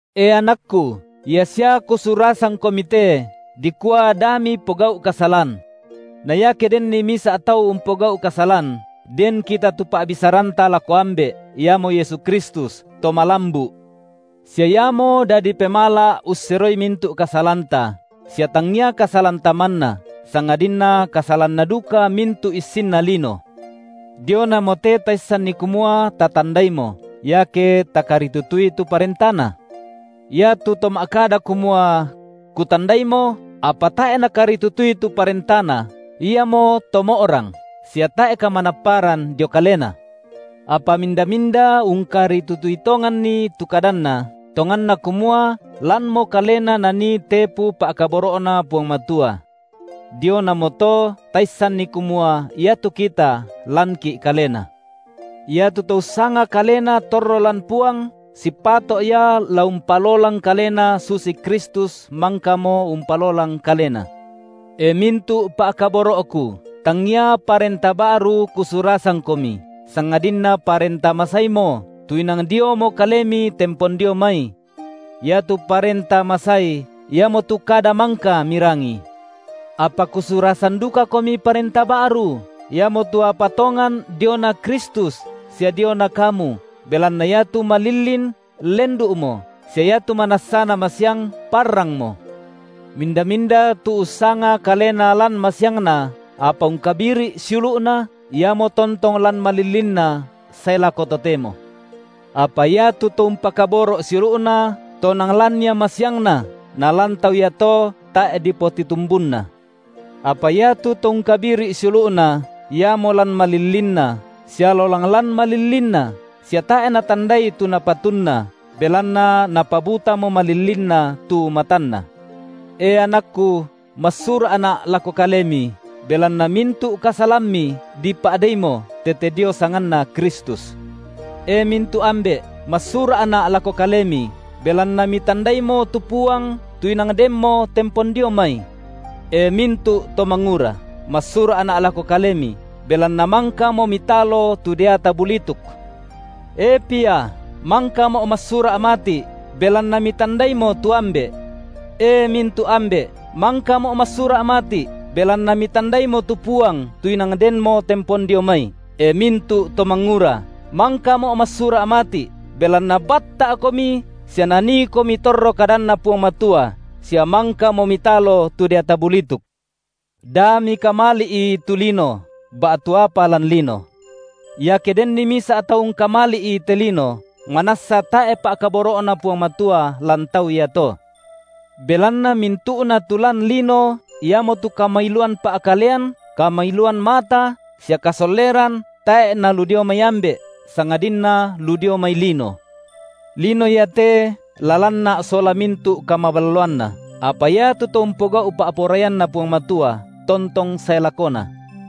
E anakku, ia sia kusurasangkomi te, dikua da mipogau’ kasalan. Na iake denni misa’ tau umpogau’ kasalan, den kita tu Pa’bisaranta lako Ambe’, iamo Yesu Kristus, To malambu’, sia Iamo dadi pemala’ usseroi mintu’ kasalanta, sia tangia kasalanta manna, sangadinna kasalanna duka mintu’ issinna lino. Dionamote taissanni kumua tatandaimo, iake takaritutui tu parentaNa. Iatu to ma’kada kumua: Kutandaimo, apa tae’ nakaritutui tu parentaNa, iamoto mo’rang, sia tae’ kamanapparan dio kalena. Apa minda-minda ungkaritutui tonganni tu kadanNa, tonganna kumua lanmo kalena nanii tepu pa’kaboro’Na Puang Matua. Dionamoto taissanni kumua iatu kita lanki’ Kalena. Iatu to ussanga kalena torro lan Puang sipato’ ia la umpalolang kalena susi Kristus mangkamo umpalolang Kalena. E mintu’ pa’kaboro’ku, tangia parenta ba’ru kusurasangkomi, sangadinna parenta masaimo, tu inang diomo kalemi tempon dio mai. Iatu parenta masai, iamotu kada mangka mirangi. Apa kusurasan dukakomi parenta ba’ru, iamotu apa tongan diona Kristus sia diona kamu, belanna iatu malillin lendu’mo sia iatu manassana masiang parrangmo. Minda-minda tu ussanga kalena lan masiangna, apa ungkabiri’ siulu’na, iamo tontong lan malillinna sae lako totemo. Apa iatu to umpakaboro’ siulu’na, tonang lan ia masiangna, nalan tau iato tae’ dipotitumbunna. Apa iatu to ungkabiri’ siulu’na, iamo lan malillinna, sia lolang lan malillinna sia tae’ natandai tu napatunna, belanna napabutamo malillinna tu matanna. E anakku, massura’na’ lako kalemi, belanna mintu’ kasalammi dipa’deimo tete dio sanganNa Kristus. E mintu’ ambe’, massura’na’ lako kalemi, belanna mitandaimo tu Puang tu inang denmo tempon dio mai. E mintu’ to mangura, massura’na’ lako kalemi, belanna mangkamo mitalo tu deata bulituk. E pia, mangkamo’ massura’ mati’, belanna mitandaimo tu Ambe’. E mintu’ ambe’, mangkamo’ massura’ mati’, belanna mitandaimo tu Puang tu inang denmo tempon dio mai. E mintu’ to mangura, mangkamo’ massura’ mati’, belanna batta’komi sia naniikomi torro kadanNa Puang Matua, sia mangkamo mitalo tu deata bulituk. Da mikamali’i tu lino ba’tu apa lan lino. Iake denni misa’ tau ungkamali’i te lino, manassa tae’ pa’kaboro’Na Puang Matua lan tau iato. Belanna mintu’na tu lan lino, iamotu kamailuan pa’kalean, kamailuan mata, sia kasolleran, tae’ nalu dio mai Ambe’, sangadinna lu dio mai lino. Lino iate la lanna’ sola mintu’ kamaballoanna, apa iatu to umpogau’ pa’poraianNa Puang Matua tontong sae lakona.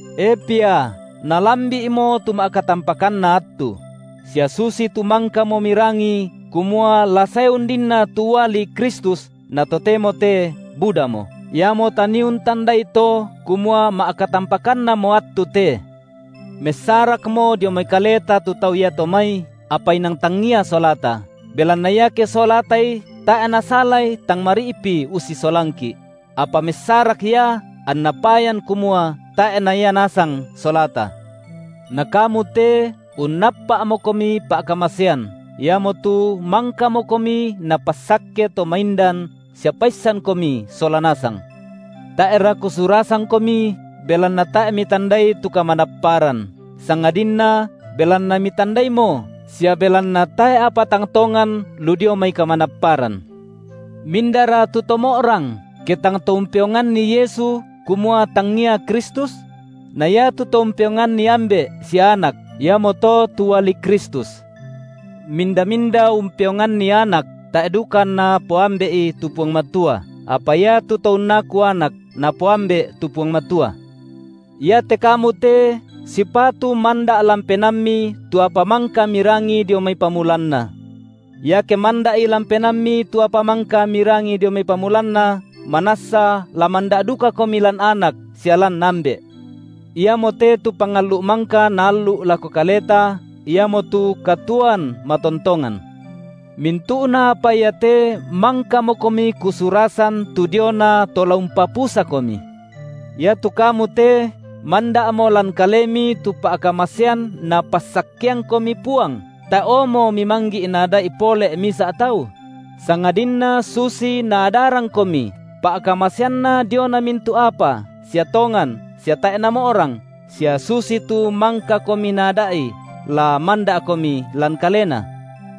E pia, nalambi’mo tu ma’katampakanna attu; sia susitu mangkamo mirangi kumua la sae undinna tu uali Kristus, na totemo te budamo; iamo tanii untandai to kumua ma’katampakannamo attu te. Messarakmo dio mai kaleta tu tau iato mai, apa inang tangia solata, belanna iake solatai tae’ nasalai tang mari’pi ussisolangki’; apa messarak ia anna payan kumua tae’ na ia nasang solata. Na kamu te unnappa’mokomi pa’kamasean, iamotu mangkamokomi Napassakke To maindan sia paissankomi sola nasang. Tae’ra kusurasangkomi, belanna tae’ mitandai tu kamanapparan, sangadinna belanna mitandaimo sia belanna tae’ apa tang tongan lu dio mai kamanapparan. Mindara tu to mo’rang, ke tang to umpeonganni Yesu, kumua tangia Kristus? Na iatu to umpeonganni Ambe’ sia Anak, iamoto tu uali Kristus. Minda-minda umpeonganni Anak, tae’ duka anna poAmbe’i tu Puang Matua, apa iatu to unnaku Anak, napoAmbe’ tu Puang Matua. Iate kamu te, sipatu manda’ lan penaammi tu apa mangka mirangi dio mai pamulanna. Iake manda’i lan penaammi tu apa mangka mirangi dio mai pamulanna, manassa la manda’ dukakomi lan Anak sia lan Ambe’. Iamote tu pangallu’ mangka Naallu’ lako kaleta, iamotu katuoan matontongan. Mintu’na apa iate mangkamokomi kusurasan tu diona to la umpapusakomi. Iatu kamu te, manda’mo lan kalemi tu pa’kamasean Napassakkeangkomi Puang, tae’omo mimanggi’ naada’i pole’ misa’ tau: sangadinna susi Naadarangkomi pa’kamaseanNa diona mintu’ apa sia tongan sia tae’ namo’rang, sia susitu mangkakomi Naada’i, la manda’komi lan Kalena.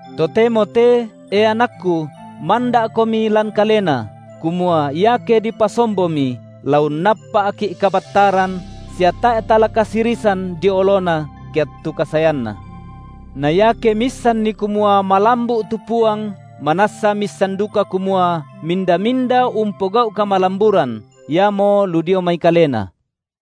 Totemo te, e anakku, manda’komi lan Kalena, kumua iake dipasombomi, la unnappa’ki’ kabattaran sia tae’ tala kasirisan dio oloNa, ke attu kasaeanNa. Na iake miissanni kumua malambu’ tu Puang, manassa miissan duka kumua minda-minda umpogau’ kamalamburan, iamo lu dio mai Kalena.